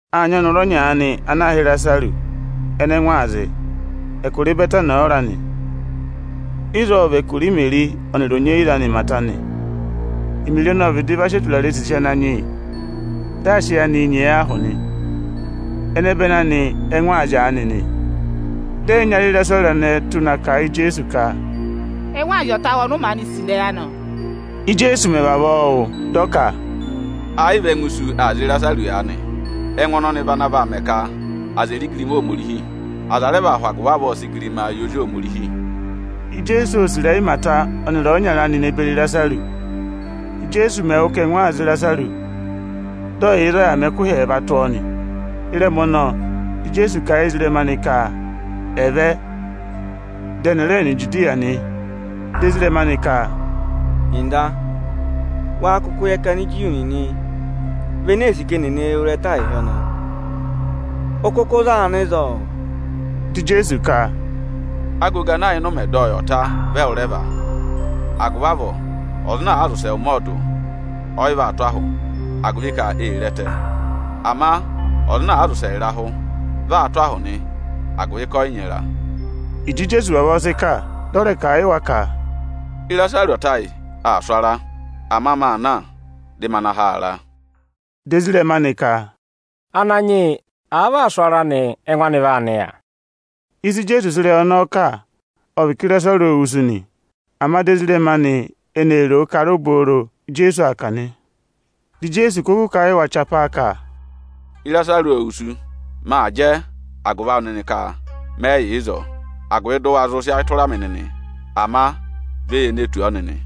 Â nyị ọnọrụ ọnya aanị ana aā hị́ Ịrasarụsị, ẹnẹ ẹngụ aa zị. Ẹkụra Ịbẹtanị ọ ra nị. Ịzọọ ọ vị ẹkụra Imeri ọnịrị onyeyiza anị Ịmata nị. Imeri ọnọọ ọ vịdị va sị eturare sisi Ananyị yị, dị aa sị ẹyị aanịị nyee yọ ahụ nị. Ẹnẹbẹnị anị ẹ́ngụ aa zị aanị nị. Dị ẹyịnyara Ịrasarụsị anẹẹ tụ́ na kà a yị Ijeesu ka, “Ẹngụ aa zị ọta awụ ọnị ụ maanị sì ịrẹyị anị, o.” Íjeesu mẹ̀ vavọọ wụ́, dị ọ ka, “Ẹ yị vị ẹngụ isu aa zị Ịrasarụsị aanị. Ẹngụ ọnọnị vị ana vaa mẹ ka aza è re igirima Ohomorihi. Aza rẹ vaa hụ agụvị avọọ sị igirimaa yị Ozi Ohomorihi.” Ijeesu ô sì ịrẹyị Ịmata ọnịrị ọyịnyara anị ne beri Ịrasarụsị. Íjeesu mẹ̀ wụ́ ka ẹngụ aa zị Ịrasarụsị, dị ọ yị yà ịzọọ yà mẹ ẹkụhị ẹẹva tụ́ ọọ nị. Ịrẹma ọnọọ, di Ijeesu kà yị ezirẹma anị ka ẹ̀ vẹ, dị ẹnị ẹ̀ rẹ nọ Ijudiya nị. Dị ezirẹma anị ka, “Ọga, wáá kụkụ yẹ ka Aniju nịnị vị ene ee sì ka eni è ne wu ịrẹta ịzọọ ịhị ọnọọ? Ụ kụkụ raa nọ ịzọọ?” Dị Ijeesu ka, “Agogo ana yà ịnị ụmẹ dị ọyị ọ̀ ta, vị ẹwụrẹva. Agụvị avọọ, ọza ana àa zị ụsẹ ụmẹ ọọdụ, ọ yị vaa tụ́ ahụ, agụvị ka ee re ẹtẹ. Ama aza ana àa zị ụsẹ ịrahụ, vị aa tụ́ ahụ nị, agụvị ka ẹnịnị ẹ yị nyị ịra.” Ịjị Ijeesu vavọọ sị kà, dị ọ rẹ kà a yị wa ka, “Ịrasarụsị ọta ayị aa sụ ara. Ama maa na, dị ma na ha a ara.” Dị ezirẹma anị ka, “Ananyị yị, àa vị aa sụ ara nị, ẹngụ anị vaa nịya.” Ịsị Ijeesu sị ịrẹyị ọnọọ kà, ọ vị ka Ịrasarụsị ô wusu nị, ama dị ezirẹma anị ene ro o ka ara obooro íjeesu aa kà nị. Dị Ijeesu kụkụ kà a yị wa chapaa ka, “Ịrasarụsị ô wusu nị. Maa jẹ agụvị awụ nịnị ka mẹ yị yà ịzọọ, agụvị dị ụ wa zụ sị ayị tụra mị nịnị. Ama vẹ ye ne tù ọọ nịnị!”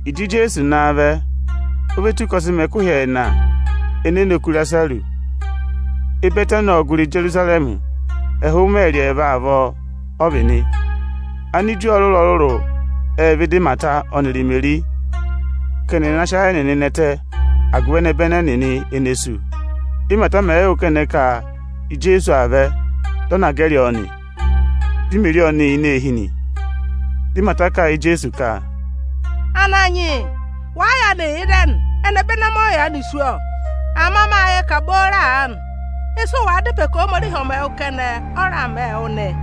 Ịjị Ijeesu naa vẹ, o ve tù ka ọ sị mẹ ẹkụhị ẹẹna ene e ne oku Ịrasarụsị. Ịbẹtanị ộ gụrị Ijerusarẹmị, ẹhụụ ịmẹẹrị ẹẹva avọọ ọ vị nị. Aniju ọrụrụ-ọrụrụ ệ vẹ ịdị Ịmata ọnịrị Imeri ka ẹnị ẹ̀ na sị ayị ẹnịnị nẹtẹ agụvị ẹnẹbẹnị ẹnịnị ene sú. Ímata mẹ̀ yị wụ́ kẹnẹ ka Ijeesu aa vẹ, dị ọ na gẹrị ọọ nị, di Imeri ọnị yà ini eehi nị. Dị Ịmata kà a yị Ijeesu ka, “Ananyị yị wàa yaanị yà ịzẹnị, ẹnẹbẹnị amị ọ yị yaanị sú, ọ! Ama mâ yẹ ka booro aanị, ịsị ụ wàa dá ịpẹ ka Ohomorihi ọ̀ mẹ wụ kẹnẹ, ọ raa mẹẹ wụ nị.”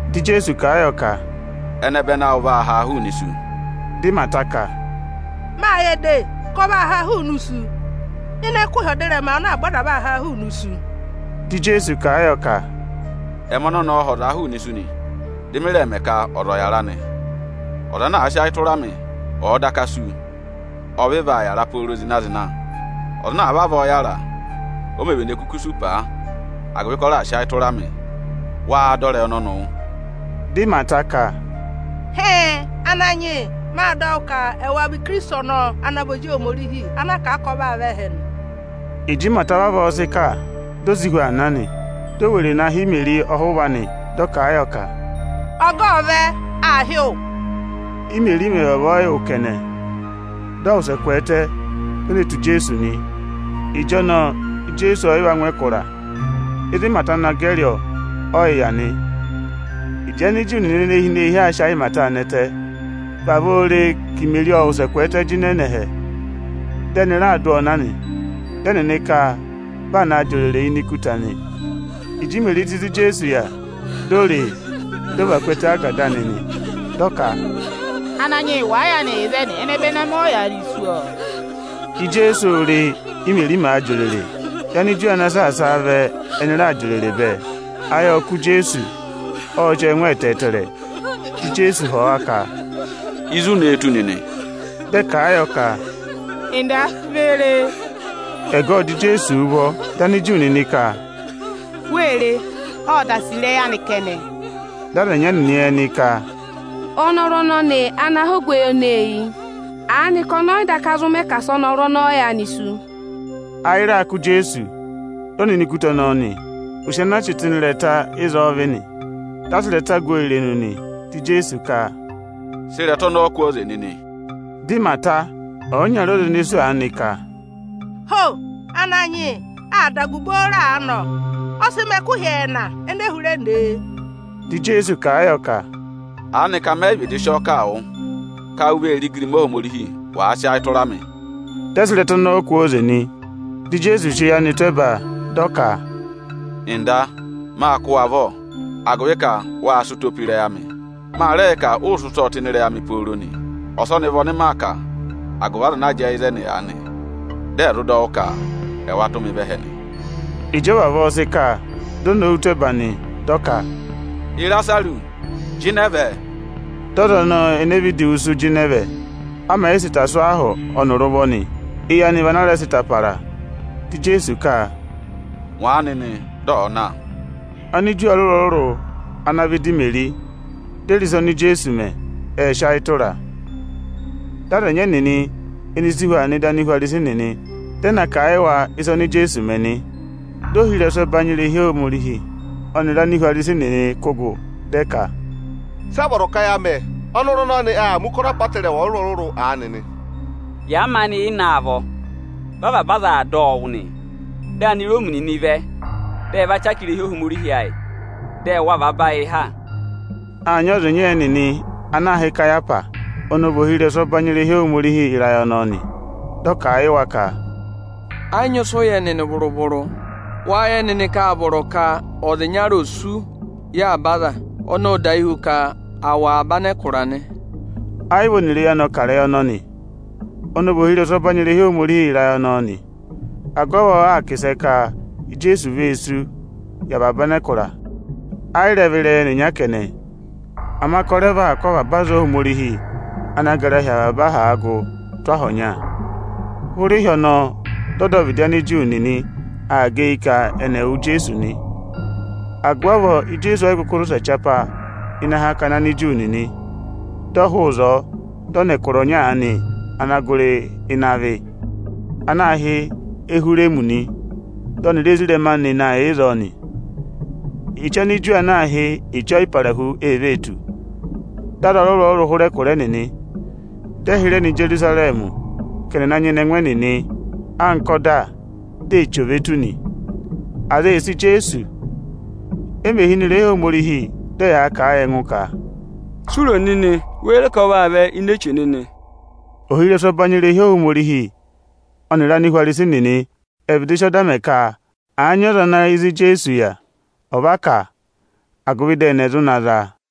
Dị Ijeesu kà a yọ ka, “Ẹnẹbẹnị awụ vaa haa hụụnị isu.” Dị Ịmata ka, “Mâ yẹ de, ka ọ vaa haa hụụnị isu ịnị ẹkụhị ọdịrẹma ana avaba aza vaa haa hụụnị isu.” Dị Ijeesu kà a yọ ka, “Ẹmị ọnọnị ọọ̄ ha ọzaa hụụnị isu, dị mị rẹ mẹ ka ọza ọ̀ yàra nị. Ọza ana àa sị ayị tụra mị, ọ̀ọ daka sú, ọ vị vaa yàra pooro zịna-zịna. Ọza ana àa vavọọ yàra, o mē vene kuku sú paa, agụvị ka ọ raà sị ayị tụra mị. Wáá dọ ịrẹyị ọnọnị wụ́?” Di Ịmata ka, “Hịịn, Ananyị yị, mâ dọ wụ́ ka ẹwa vị Ikirisiti ọnọọ ana vị Ozi Ohomorihi ana a kà a ka ọ vaa vẹ ẹhẹ nị.” Ịjị Ịmata vavọọ sị kà, di o si hu aa na nị. Di o were na hị́ Imeri ọhụva anị, dị ọ kà a yọ ka, “Ọga ộ vẹ, aa hị́ wụ.” Ímeri mẹ̀ vavọọ yị wụ́ kẹnẹ, dị ọ wụsẹ kwẹẹtẹ, di o ne tù Ijeesu nị. Ịjọnọọ Ijeesu ọọ̀ yị va ngụ ịnị ẹkụra; ịzị Ịmata na gẹrị ọọ, ọ yị yà nị. Ịjị Aniju nịnị ene hi ini eehi aa sị ayị Imeri nẹtẹ, vavọọ re ka Imeri ọ wụsẹ kwẹẹtẹ jịnẹ nọ ẹhẹ, dị ẹnị raa dụ ọọ na nị. Dị ẹnịnị ka vị aa naa jị òrèrè ini ikuta nị. Ịjị Imeri tù ịzị Ijeesu yà, di o re e, dị ọ và ku ẹtẹ ágada anị nị, dị ọ ka, “Ananyị yị, wàa yaanị yà ịzẹnị, ẹnẹbẹnị amị ọ yị yaanị sú, ọ.” Ijeesu ô re, Ímeri màa jị òrèrè, dị Aniju ana saasa a vẹ ẹnị raa jị òrèrè bẹẹ. Ịrẹyị ọnọọ ộ kanyị Ijeesu ẹnẹmẹhị, dị ọ zị ọọ ẹngụ ẹtẹẹtẹrẹ nị. Ijeesu ộ họ̀ wa ka, “Ịzị u ne e tụ́ nịnị?” Dị ẹ kà a yọ ka, “Ọga, ve re e!” Ẹgọ ộ jị Ijeesu ụvọ. Dị Aniju nịnị ka, “Wée re, ộ da sì ịrẹyị anị kẹnẹ!” Dị aza ẹnyị ẹnịnị ẹnị ka, “Ọnọrụ ọnọnị ana há ogweyi ọnọọ eyi, aanịka ọnị ọ yị daka zụ mẹ ka asị ọnọrụ ọnọọ yaanị sú?” Ịrẹyị ọnọnị ọ rẹ kanyị Ijeesu ayị ẹnẹmẹhị, dị ọ nọ ini ikuta ọnọọ nị. Ụsị ana a chị tụ́ ịnị ịrẹta ịzọọ vị nị, dị a sị ịrẹta gu ọọ irenu nị. Dị Ijeesu ka, “Sị ịrẹta ọnọọ kwooze nịnị!” Dị Ịmata, ọyịnyara ọza ene sú aanị ka, “Ho! Ananyị yị, aa dà agụ booro aanị, ọ! Ọ sị mẹ ẹkụhị ẹẹna ene e hụrẹ ne e!” Dị Ijeesu kà a yọ ka, “Aanịka mẹ yị vịdị sị ọọ kà a wụ ka u vee re igirima Ohomorihi, wàa sị ayị tụra mị?” Dị ẹ sị ịrẹta ọnọọ kwooze nị. Dị Ijeesu sị eyi anị tụ́ ẹba, dị ọ ka, “Ọga, mâ kụ́ wụ avọ, agụvị ka wâ sị ụtọ tụ́ ịnị ịrẹyị amị. Ma rẹ yẹ ka ụụ̄ sị ụtọọ tụ́ ịnị ịrẹyị amị pooro nị Ọsọnị vị ọnị maa kà, agụvị aza ana jẹẹ ịzẹnị aanị, dị ẹ̀ zụ dọ wụ́ ka ẹwa tụ́ mị vẹ ẹhẹ nị.” Ịjị ọ vavọọ sị kà, di o nowu tụ́ ẹba nị, dị ọ ka, “Ịrasarụsị! jịnẹ vẹ!” Dị ọza ọnọọ ene vịdị wusu jịnẹ vẹ, a mẹ̀ yị sị ịta sụ́ ọ ahụ ọnịrị ụvọ nị. Eyi anị vị ana a rẹ sị ịta para. Dị Ijeesu ka, “Ngwa a nịnị, dị ọ̀ọ na!” Aniju ọrụrụ-ọrụrụ ana vẹ ịdị Imeri, di e re ịsa oni Ijeesu mẹ, ệ sị ayị tụra a. Dị aza ẹnyị ẹnịnị ẹnị si hu aa nọ ịdị Anihwarisi nịnị, dị ẹ na kà a yị wa ịsa oni Ijeesu mẹ nị. Dị ohirẹsụ ẹbanyị irehi Ohomorihi ọnịrị Anihwarisi nịnị kụ́ gụ, dị ẹ ka, “Sị a vọrọ ka ya mẹ? Ọnọrụ ọnọnị aa mẹ̀ ụkọrọ apọtẹrẹwa ọrụrụ-ọrụrụ aanị nị. Yàa maanị yị na a vọ, vị avaba aza aa dọ ọ wụ́ nị. Dị Aniroomi nịnị vẹ, dị ẹ va chaka irehi Ohomorihi ayị, dị ẹ wụ̀ avaba ayị và ha.” Â nyị ọza ịnya ẹnịnị ana aā hị́ Ikayahwasi, ọnị ọ vị ohirẹsụ ọbanyị irehi Ohomorihi ịrayị ọnọọ nị. Dị ọ kà a yị wa ka, “Ẹ yị nyị ịsị ụ yẹ nịnị vụrụ-vụrụ. Wáá yẹ nịnị ka â vọrọ ka ọza ịnyara òsú yị avaba aza. Ọnọọ ọ dahi hu ka à wụ̀ avaba anẹkụra nị.” Ẹ yị vị ọnịrị eyi anị ọ kà ịrẹyị ọnọnị. Ọnị ọ vị ohirẹsụ ọbanyị irehi Ohomorihi ịrayị ọnọọ nị; agụvị avọọ aa kà ịsẹ ka Ijeesu vee súu yị avaba anẹkụra nị. Ẹ yị rẹ vị ịrẹyị ẹnịnya kẹnẹ, ama ka ọ rẹ vaa kụ́ avaba aza Ohomorihi ana gara hi avaba aha gụ tụ́ aha ọnya. Hụrẹ ịhị ọnọọ dị ọdọvịdị Aniju nịnị aa gẹ eyi ka ẹnị ẹ̀ wụ Ijeesu nị. Agụvị avọọ Ijeesu ọ yị kụkụ zị ụsẹ chapaa ịnị akakana Aniju nịnị. Dị ọ hụụ ịzọọ, dị ọ nọ ẹkụra ọnya aanị ana gụrị ịnị avị, ana aā hị́ Ehwireemi nị. Dị ọnịrị ezirẹma anị na yà ịzọọ nị. Eche Aniju ana aā hị́ Eche Ọyịparahu ee vee tù. Dị aza ọrụrụ-ọrụrụ hụrẹ ẹkụra ẹnịnị, dị ẹ hịrẹ nọ Ijerusarẹmị ka ẹnị ẹ̀ na mẹ̀ ido ọyị mẹ ẹngụ ẹnịnị nị (anka ọda mẹ̀ kà a), di eche ò ve tù. Aza ee sì Ijeesu. E mè hi ini irehi Ohomorihi, dị ẹyaa kà a yị ẹngụ ka, “Si u ro nịnị? Wéé ro ka ọ vaa vẹ ini eche nịnị?” Ohirẹsụ ẹbanyị irehi Ohomorihi ọnịrị Anihwarisi nịnị ệ vịdị sị ọda mẹ ka àa nyị ọza ana yẹ ịzị Ijeesu yà, ọ̀ va kà a, agụvị dị ẹnị ẹ̀ zụ na za a.